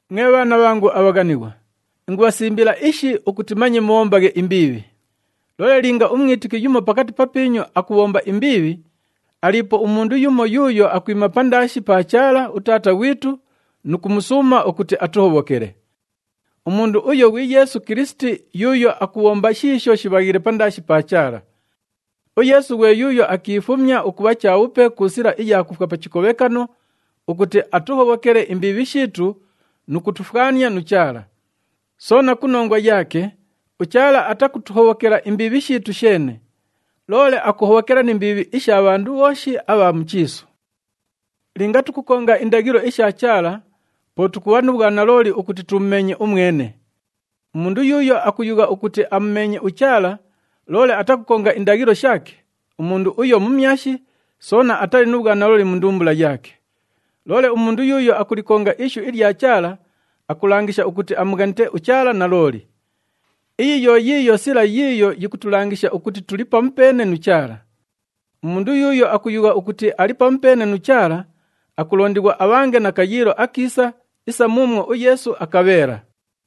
Mwe bhaana bhangu abhaghanighwa, ingubhasimbila ishi ukuti manye mubhombaghe imbiibhi. Loole linga umwitiki yumo pakati papiinyu akubhomba imbiibhi, aliipo umundu yumo yuuyo akwima pandaashi pa Chaala uTaata ghwitu nu kumusuuma ukuti atuhobhokele. Umundu uyo ghwi Yeesu Kilisiti yuuyo akubhomba shiisho shibhaghiile pandaashi pa Chaala. UYeesu ghwe yuuyo akiifumya ukubha chabhupe ku sila iya kufwa pa chikobhekano ukuti atuhobhokele imbiibhi shiitu nu kutufwania nu Chaala. Soona ku nongwa yaake, uChaala atakutuhobhokela imbiibhi shiitu sheene, loole akuhobhokela ni mbiibhi isha bhandu bhooshi abha mu chiisu. Linga tukukonga indaghilo isha Chaala, po tukubha nu bhwanalooli ukuti tumumeenye umwene. Umundu yuuyo akuyugha ukuti amumeenye uChaala loole atakukonga indaghilo shaake, umundu uyo mumyashi, soona atali nu bhwanalooli mu ndumbula yaake. Loole umundu yuuyo akulikonga ishu ilya Chaala, akulangisha ukuti amughanite uChaala nalooli. Iyi yo yiiyo sila yiiyo yikutulangisha ukuti tuli pamupeene nu Chaala. Umundu yuuyo akuyugha ukuti ali pamupeene nu Chaala, akulondighwa abhange na kayiilo akiisa isa muumwo uYeesu akabheela.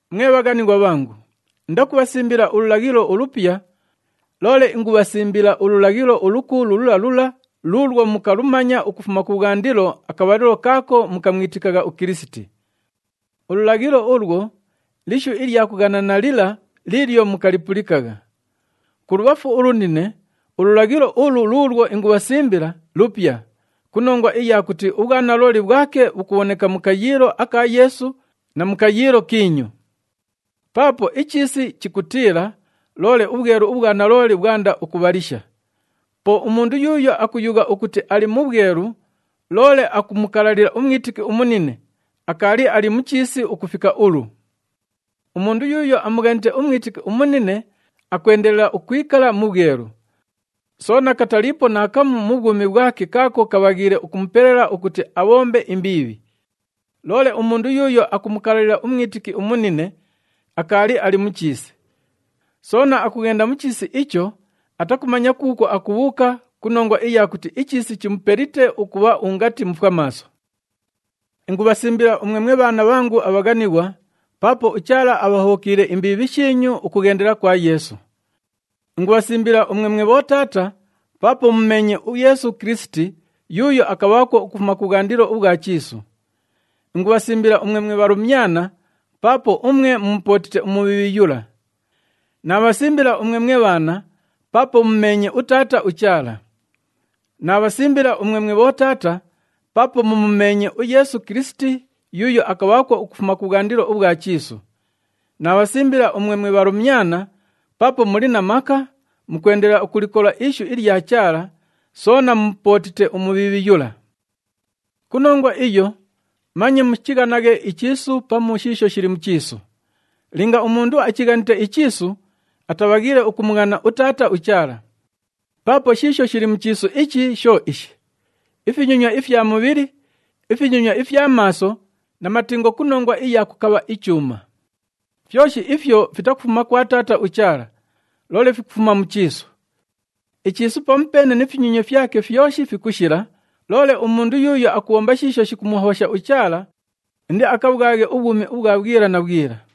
Mwe bhaghanighwa bhangu, indakubhasimbila ululaghilo ulupya, loole ingubhasimbila ululaghilo ulukuulu lula lula luulwo mukalumanya ukufuma kubhwandilo akabhalilo kaako mukamwitikagha uKilisiti. Ululaghilo ulwo lishu ilya kughanana lila liilyo mukalipulikagha. Kulubhafu ulunine, ululaghilo ulu luulwo ingubhasimbila lupya ku nongwa iya kuti ubhwanalooli bhwake bhukubhoneka mu kayiilo aka Yeesu na mu kayiilo kiinyu. Paapo ichiisi chikutiila, loole ubhwelu ubhwa nalooli bhwanda ukubhalisha. Po umundu yuuyo akuyugha ukuti ali mu bhwelu loole akumukalalila umwitiki umunine, akaali ali mu chiisi ukufika ulu. Umundu yuuyo amughanite umwitiki umunine, akwendelela ukwikala mu bhwelu. Soona kataliipo naakamu mu bhwumi bhwake kaako kabhaghiile ukumupelela ukuti abhombe imbiibhi. Loole umundu yuuyo akumukalalila umwitiki umunine, akaali ali mu chiisi. Soona akughenda mu chiisi icho, atakumanya kuukwo akubhuuka ku nongwa iya kuti ichiisi chimupelite ukubha ungati mufwamaaso. Ingubhasimbila umwe mwe bhaana bhangu abhaghanighwa, paapo uChaala abhahobhokiile imbiibhi shiinyu ukughendela kwa Yeesu. Ingubhasimbila umwe mwe bhotaata paapo mumumeenye uYeesu Kilisiti yuuyo akabhaakwo ukufuma kubhwandilo ubhwa chiisu. Ingubhasimbila umwe mwe bhalumyana, paapo umwe mumupootite uMubhiibhi yula. Naabhasimbila umwe mwe bhaana, paapo mumumeenye uTaata uChaala. Naabhasimbila umwe mwe bhotaata paapo mumumeenye uYeesu Kilisiti, yuuyo akabhaakwo ukufuma kubhwandilo ubhwa chiisu. Naabhasimbila umwe mwe bhalumyana, paapo muli na maka, mukwendelela ukulikola ishu ilya Chaala, soona mumupootite uMubhiibhi yula. Ku nongwa iyo, manye muchighanaghe ichiisu pamu shiisho shili mu chiisu. Linga umundu achighanite ichiisu, atabhaghiile ukumughana uTaata uChaala. Paapo shiisho shili mu chiisu ichi sho ishi: ifinyonywa ifya mubhili, ifinyonywa ifya maaso na matingo ku nongwa iya kukabha ichuuma. Fyoshi ifyo fitakufuma kwa Taata uChaala, loole fikufuma mu chiisu. Ichiisu pamupeene ni finyonywa fyake fyoshi fikushila, loole umundu yuuyo akubhomba shiisho shikumuhobhosha uChaala, indiakabhwaghe ubhwumi ubhwa bhwila na bhwila.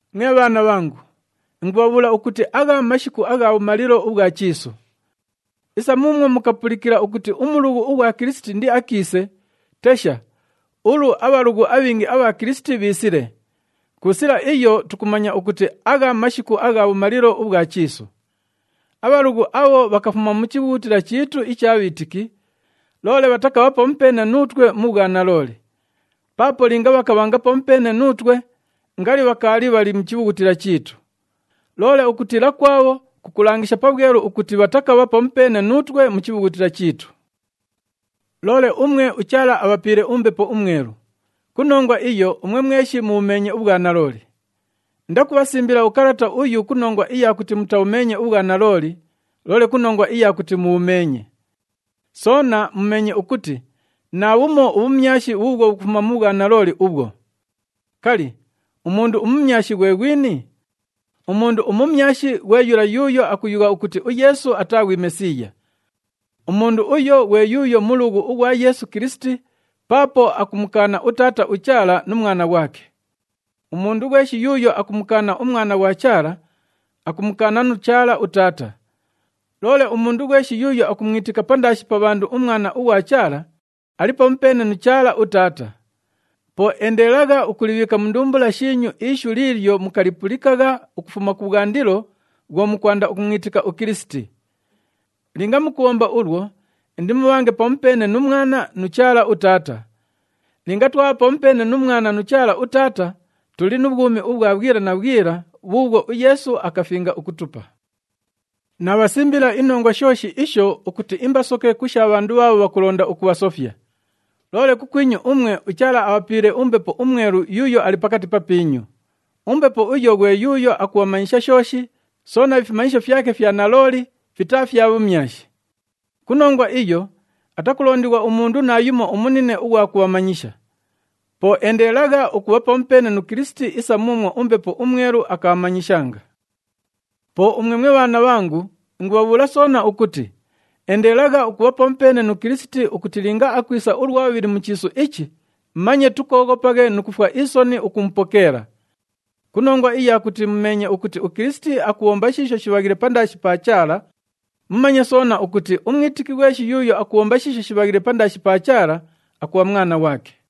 Mwe bhaana bhangu, ingubhabhuula ukuti agha mashiku agha bhumalilo ubhwa chiisu. Isa muumwo mukapulikila ukuti umulughu ughwa Kilisiti indiakiise, tesha, ulu abhalughu abhingi abha Kilisiti bhiisile. Ku sila iyo tukumanya ukuti agha mashiku agha bhumalilo ubhwa chiisu. Abhalughu abho bhakafuma mu chibhughutila chiitu icha bhiitiki, loole bhatakabha pamupeene nuutwe mu bhwanalooli. Paapo linga bhakabhanga pamupeene nuutwe, ngali bhakaali bhali mu chibhughutila chiitu. Loole ukutiila kwabho, kukulangisha pabhwelu ukuti bhatakabha pamupeene nuutwe mu chibhughutila chiitu. Loole umwe uChaala abhapiile uMbepo uMwelu. Ku nongwa iyo umwe mweshi mubhumeenye ubhwanalooli. Indakubhasimbila ukalata uyu ku nongwa iya kuti mutabhumeenye ubhwanalooli, loole ku nongwa iya kuti mubhumeenye. Soona mumeenye ukuti naabhumo ubhumyashi bhuubhwo bhukufuma mu bhwanalooli ubhwo. Kali, umundu umumyashi ghwe ghwini? Umundu umumyashi ghwe yula yuuyo akuyugha ukuti uYeesu ataa ghwi Mesiiya. Umundu uyo ghwe yuuyo mulughu ughwa Yeesu Kilisiti paapo akumukaana uTaata uChaala nu Mwana ghwake. Umundu ghweshi yuuyo akumukaana uMwana ughwa Chaala, akumukaana nu Chaala uTaata. Loole umundu ghweshi yuuyo akumwitika pandaashi pa bhandu uMwana ughwa Chaala, ali pamupeene nu Chaala uTaata. Po endelelagha ukulibhiika mu ndumbula shiinyu ishu liilyo mukalipulikagha ukufuma kubhwandilo bhwo mukwanda ukumwitika uKilisiti. Linga mukubhomba ulwo, indimubhange pamupeene nu Mwana nu Chaala uTaata. Linga twabha pamupeene nu Mwana nu Chaala uTaata, tuli nu bhwumi ubhwa bhwila na bhwila bhuubhwo uYeesu akafinga ukutupa. Naabhasimbila inongwa shooshi isho ukuti imbasoke ku sha bhandu bhaabho bhakulonda ukubhasofya. Loole kukwinyu umwe uChaala abhapiile uMbepo uMwelu yuuyo ali pakati papiinyu. UMbepo uyo ghwe yuuyo akubhamanyisha shooshi, soona ifimanyisho fyake fya nalooli, fitaa fya bhumyashi. Ku nongwa iyo atakulondighwa umundu naayumo umunine ughwa kubhamanyisha. Po endelelagha ukubha pamupeene nu Kilisiti isa muumwo uMbepo uMwelu akabhamanyishanga. Po umwe mwe bhaana bhangu, ingubhabhuula soona ukuti endelelagha ukubha pamupeene nu Kilisiti ukuti linga akwisa ulwa bhubhili mu chiisu ichi manye tukooghopaghe nu kufwa isoni ukumupokeela. Ku nongwa iya kuti mumeenye ukuti uKilisiti akubhomba shiisho shibhaghiile pandaashi pa Chaala, mumanye soona ukuti umwitiki ghweshi yuuyo akubhomba shiisho shibhaghiile pandaashi pa Chaala, akubha mwana ghwake.